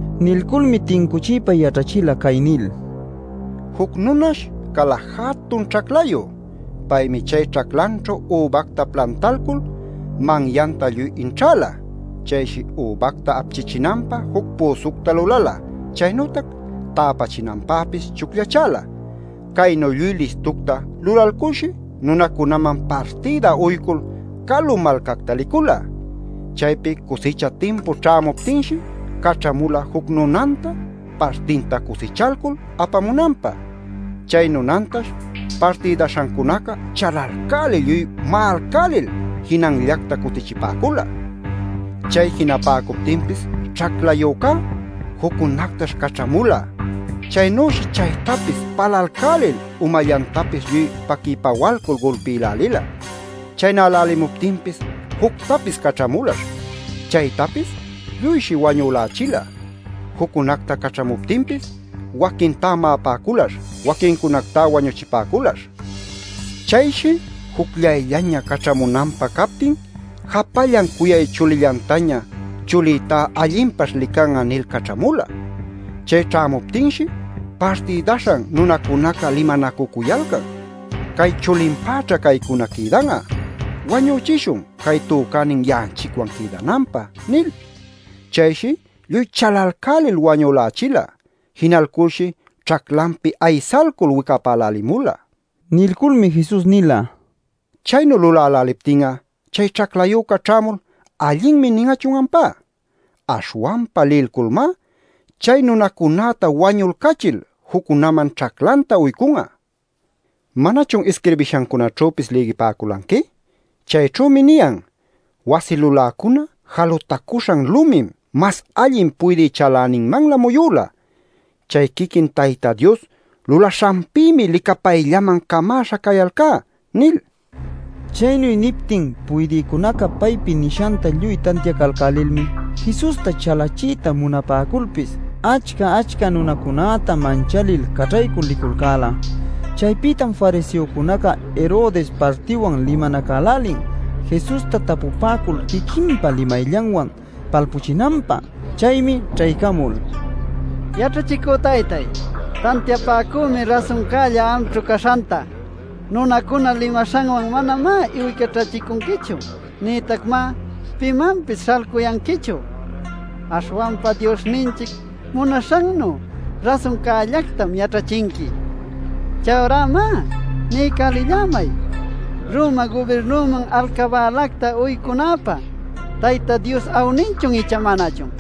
Nilculmi tincuchiypa yaćhachila cay nil: “Juc nunash cala jatun ćhaclayu. Paymi chay ćhaclanćhu übacta plantalcul manyanta lluy inćhäla. Chayshi übacta apchichinanpä juc püsucta lulala, chaynütac täpachinanpäpis chucllachäla. Caynu lluy listucta lulalculshi nunacunaman partïda uycul calu malcacta licula. Chaypi cusicha timpu ćhämuptinshi caćhamula juc nunanta partinta cusichalcul apamunanpä. Chay nunantash partïdaśhancunaca chalalcälil lluy ma'alcälil jinanllacta cutichipäcula. Chay jinapäcuptinpis ćhaclayücá juccunactash caćhamula. Chaynüshi chaytapis palalcälil umallantapis lluy paquï-pawalcul gulpïlälila. Chaynälälimuptinpis juctapis caćhamulash. Chaytapis lluyshi wañülächila. Juccunacta caćhamuptinpis waquintá ma'apäculash, waquincunactá wañuchipäculash. Chayshi jucllayllaña caćhamunanpä captin japallan cuyay chulillantaña ‘chulïtá allinpaćh lican'a’ nil caćhamula. Chay ćhämuptinshi, partïdaśhan nunacunaca limanacucuyalcan: ‘Cay chulinpäćha caycuna quïdan'a. Wañüchishun cay tücänin ya'anchicwan quïdananpä’ nil. Chayshi lluy chalalcälil wañülächila. Jinalculshi ćhaclanpi aysalcul wicapälälimula” nil. Nilculmi Jesus nila: “¿Chaynu luläläliptin'a chay ćhaclayüca ćhämul ‘allinmi’ nin'achun ampá? Aśhwanpa lilculmá chay nunacunäta wañulcachil juccunaman ćhaclanta uycun'a. ¿Manachun isquirbishancunaćhüpis lïgipäculanqui? Chayćhümi niyan: ‘Wasi luläcuna jalutacuśhan lumim mas allin puydï chaläninmanlä muyüla. Chay quiquin Tayta Dios lulaśhanpïmi licapayllaman camäśha cayalcá’ nil” nila. Chaynu niptin puydïcunaca paypi nishanta lluy tantiacalcälilmi Jesusta chalachiyta munapäculpis achca-achca nunacunäta manchalil caćhaycul liculcäla. Chaypïtam fariseocunaca, Herodes partiwan limanacälälin Jesusta tapupäcul quiquinpa limayllanwan palpuchinanpä. Chaymi ćhaycamul: “Yaćhachicü taytáy, tantiapäcümi rasuncälla amćhu caśhanta. Nunacuna limaśhanwan manamá iwiycaćhachicunquichu nïtacmá pimanpis śhalcuyanquichu. Aśhwanpa Diosninchic munaśhannu rasuncällactam yaćhachinqui. Chayurá má, niycälillämay ¿Roma gubirnuman alcabälacta uycunapä Tayta Dios awninchun icha manachun?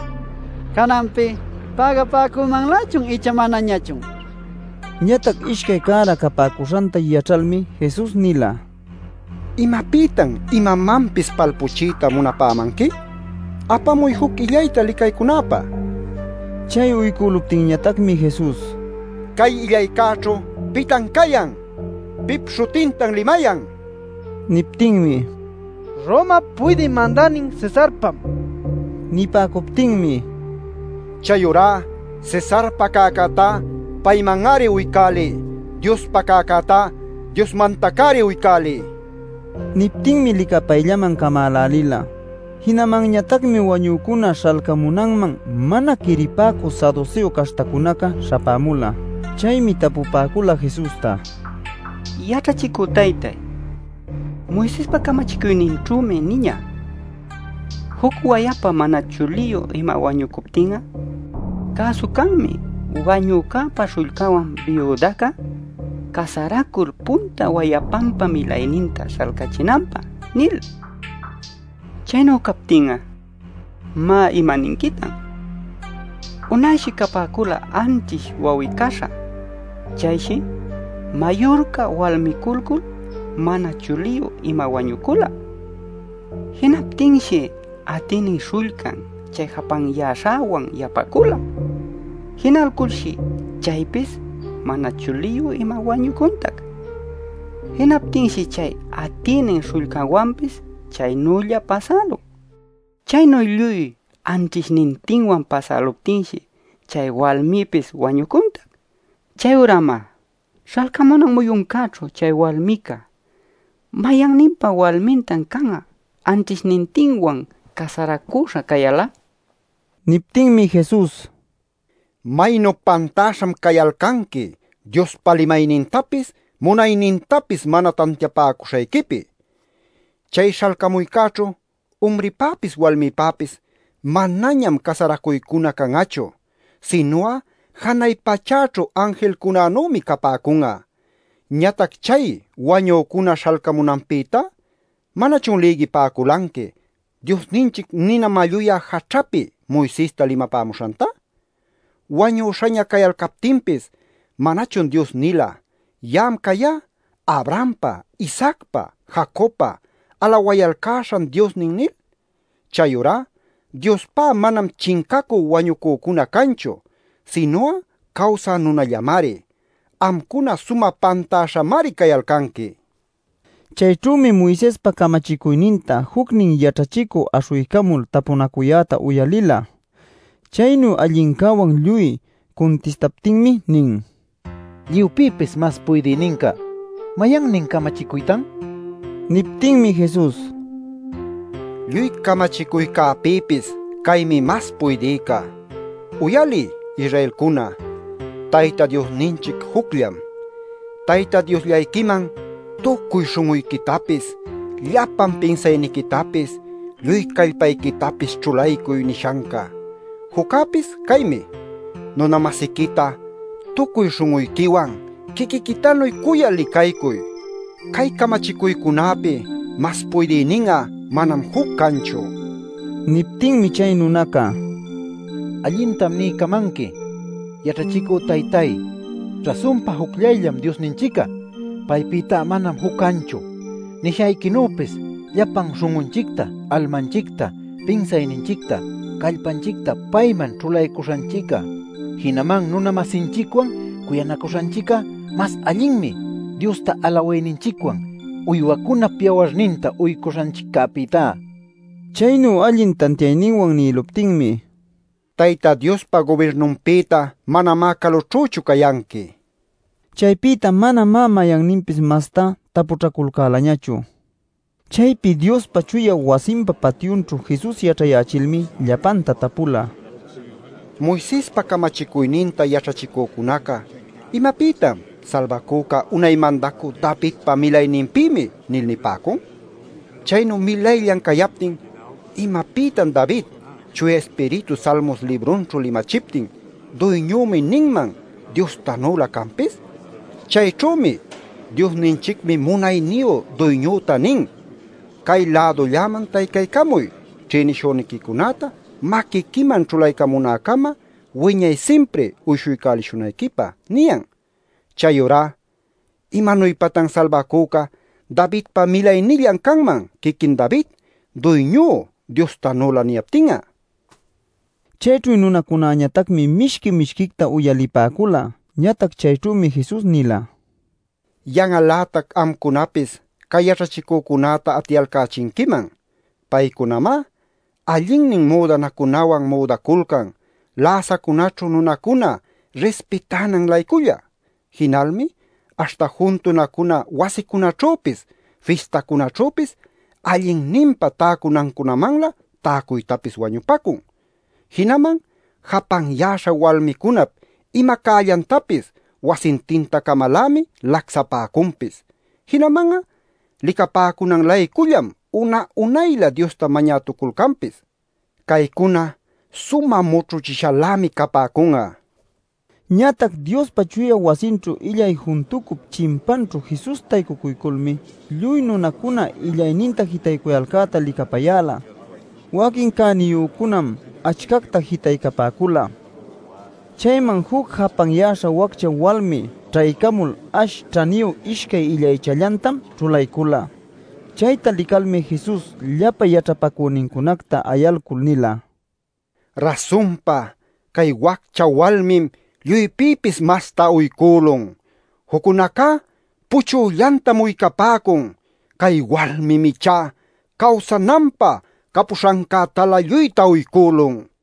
Cananpi ¿pägapäcümanlächun icha manañachun?” nipäcula. Ñatac ishcay cära capäcuśhanta yaćhalmi Jesus nila: “¿Imapïtan imamanpis palpuchiyta munapämanqui? Apamuy juc illayta licaycunäpä” nil. Chay uycüluptinñatacmi Jesus: “Cay illaycäćhu ¿pitan cayan? ¿Pip śhutintan limayan?” nila. Niptinmi: “Romap Puydï Mandänin Cesarpam” nipäcula. Nipäcuptinmi: “Chayurá Cesarpa cäcätá payman-ari uycäliy. Diospa cäcätá Diosmantac-ari uycäliy” nila. Niptinmi licapayllaman camälälila. Jinamanñatacmi wañücuna śhalcamunanman mana quiripäcü saduseo caśhtacunaca śhapämula. Chaymi tapupäcula Jesusta: “Yaćhachicü taytay, Moisespa camachicuyninćhümi niñä: ‘Juc wayapa mana chuliyu ima wañucuptin'a, cäsu canmi wanücäpa śhullcanwan biudaca casaracul punta wayapanpa milayninta śhalcachinanpä’ nil. Chaynu captin'a, má, ¿imaninquitan? Unayshi capäcula anćhish wawi-caśha. Chayshi mayurca walmiculcul mana chuliyu ima wañucula. Jinaptinshi atïnin śhullcan chay japanyäśhäwan yapacüla. Jinalculshi chaypis mana chuliyu ima wañucuntac. Jinaptinshi chay atïnin śhullcanwanpis chaynülla pasälun. Chaynu lluy anćhishnintinwan pasäluptinshi chay walmipis wañucuntac. Chayurá má, śhalcamunan muyuncäćhu chay walmica ¿mayanninpa walmintan can'a anćhishnintinwan casaracüśha cayal'a?” nin. Niptinmi Jesus: “¡Maynu pantäśham cayalcanqui Diospa limaynintapis munaynintapis mana tantiapäcuśhayquipi! Chay śhalcamuycäćhu umripäpis walmipäpis manañam casaracuycuna can'achu. Sinu'a janay pachäćhu anjilcunanümi capäcun'a. Ñatac chay wañücuna śhalcamunanpïtá ¿manachun lïgipäculanqui Diosninchic nina malluyä jaćhapi Moisesta limapämuśhanta? Wañüśhaña cayalcaptinpis ¿manachun Dios nila: ‘Ya'am cayá Abrahampa, Isaacpa, Jacobpa alawayalcäśhan Diosnin’ nil? Chayurá Diospá manam chincacü wañucücuna canchu; sinu'a cawsä nunallamari. Amcuna sumä pantäśhamari cayalcanqui” nila. Chayćhümi Moisespa camachicuyninta jucnin yaćhachicü aśhuycamul tapunacuyäta uyalila. Chaynu allincäwan lluy cuntistaptinmi nin: “Lluypïpis mas puydïninca ¿mayannin camachicuytan?” nil. Niptinmi Jesus: “Lluy camachicuycäpïpis caymi mas puydïca: ‘Uyaliy, Israelcuna, Tayta Diosninchic jucllam. Tayta Diosllayquiman tucuy śhun'uyquitapis, llapan pinsayniquitapis, lluy callpayquitapis ćhulaycuy’ nishanca. Juccäpis caymi: ‘Nuna-masiquita tucuy śhun'uyquiwan quiquiquitanuy cuyal licaycuy’. Cay camachicuycunäpi mas puydïnin'a manam juc canchu” nila. Niptinmi chay nunaca: “Allintam niycamanqui, yaćhachicü taytáy, rasunpa jucllayllam Diosninchic'a. Paypïta manam juc canchu. Nishayquinüpis llapan śhun'unchicta almanchicta pinsayninchicta callpanchicta payman ćhulaycuśhanchic'a, jinaman nuna-masinchicwan cuyanacuśhanchic'a mas allinmi Diosta alawayninchicwan uywacunap yawarninta uycuśhanchiccäpïtá” nila. Chaynu allin tantiayninwan nïluptinmi: “Tayta Diospa gubirnunpïta manamá calućhüchu cayanqui” nila. Chaypïta manamá mayanninpis mastá tapućhaculcälañachu. Chaypi Diospa chuya wasinpa patyunćhu Jesus yaćhayächilmi llapanta tapula: “Moisespa camachicuyninta yaćhachicücunaca, ¿imapïtam ‘Salbacüca unay Mandacü Davidpa milayninpïmi’ nil nipäcun? Chaynu milayllan cayaptin ¿imapïtan David Chuya Ispiritu Salmos librunćhu limachiptin ‘Duyñümi’ ninman Diostanülä canpis? Chayćhümi: ‘Diosninchicmi munayniyu Duyñüta nin: “Cay-lädulläman taycaycamuy ćhïnishüniquicunäta maquiquiman ćhulaycamunäcama wiñay simpri uyshuycälishunayquipä” ’ niyan. “Chayurá ¿imanuypatan Salbacüca Davidpa milaynillan canman quiquin David ‘Duyñú’ Diostanülä niyaptin'a?” nin. Chayćhu nunacunäñatacmi mishqui mishquicta uyalipäcula. Ñatac chayćhümi Jesus nila: “Yan'al-lätac amcunapis cay yaćhachicücunäta atiyalcächinquiman. Paycunamá allinnin müdanacunawan müdaculcan läsacunäćhu nunacuna rispitänan-layculla. Jinalmi aśhta juntunacuna wasicunaćhüpis fistacunaćhüpis allinninpa täcunancunamanlä täcuytapis wañupacun. Jinaman japanyäśha walmicunap ima cällantapis wasintintacamalämi lacsapäcunpis. Jinaman'a licapäcunan-laycullam una-unaylä Diosta mañätuculcanpis. Caycuna sumä mućhuchishalämi capäcun'a” nila. Ñatac Diospa chuya wasinćhu illay juntucup chimpanćhu Jesus taycucuyculmi lluy nunacuna illayninta jitaycuyalcäta licapayäla. Waquin cäniyücunam achcacta jitaycapäcula. Chayman juc japanyäśha waccha walmi ćhaycamul ash ćhaniyu ishcay illaychallantam ćhulaycula. Chayta licalmi Jesus llapa yaćhapacünincunacta ayalcul nila: “Rasunpa cay waccha walmim lluypïpis masta uycülun. Juccunacá puchüllantam uycapäcun. Cay walmim ichá cawsananpä capuśhancätalä lluyta uycülun” nil.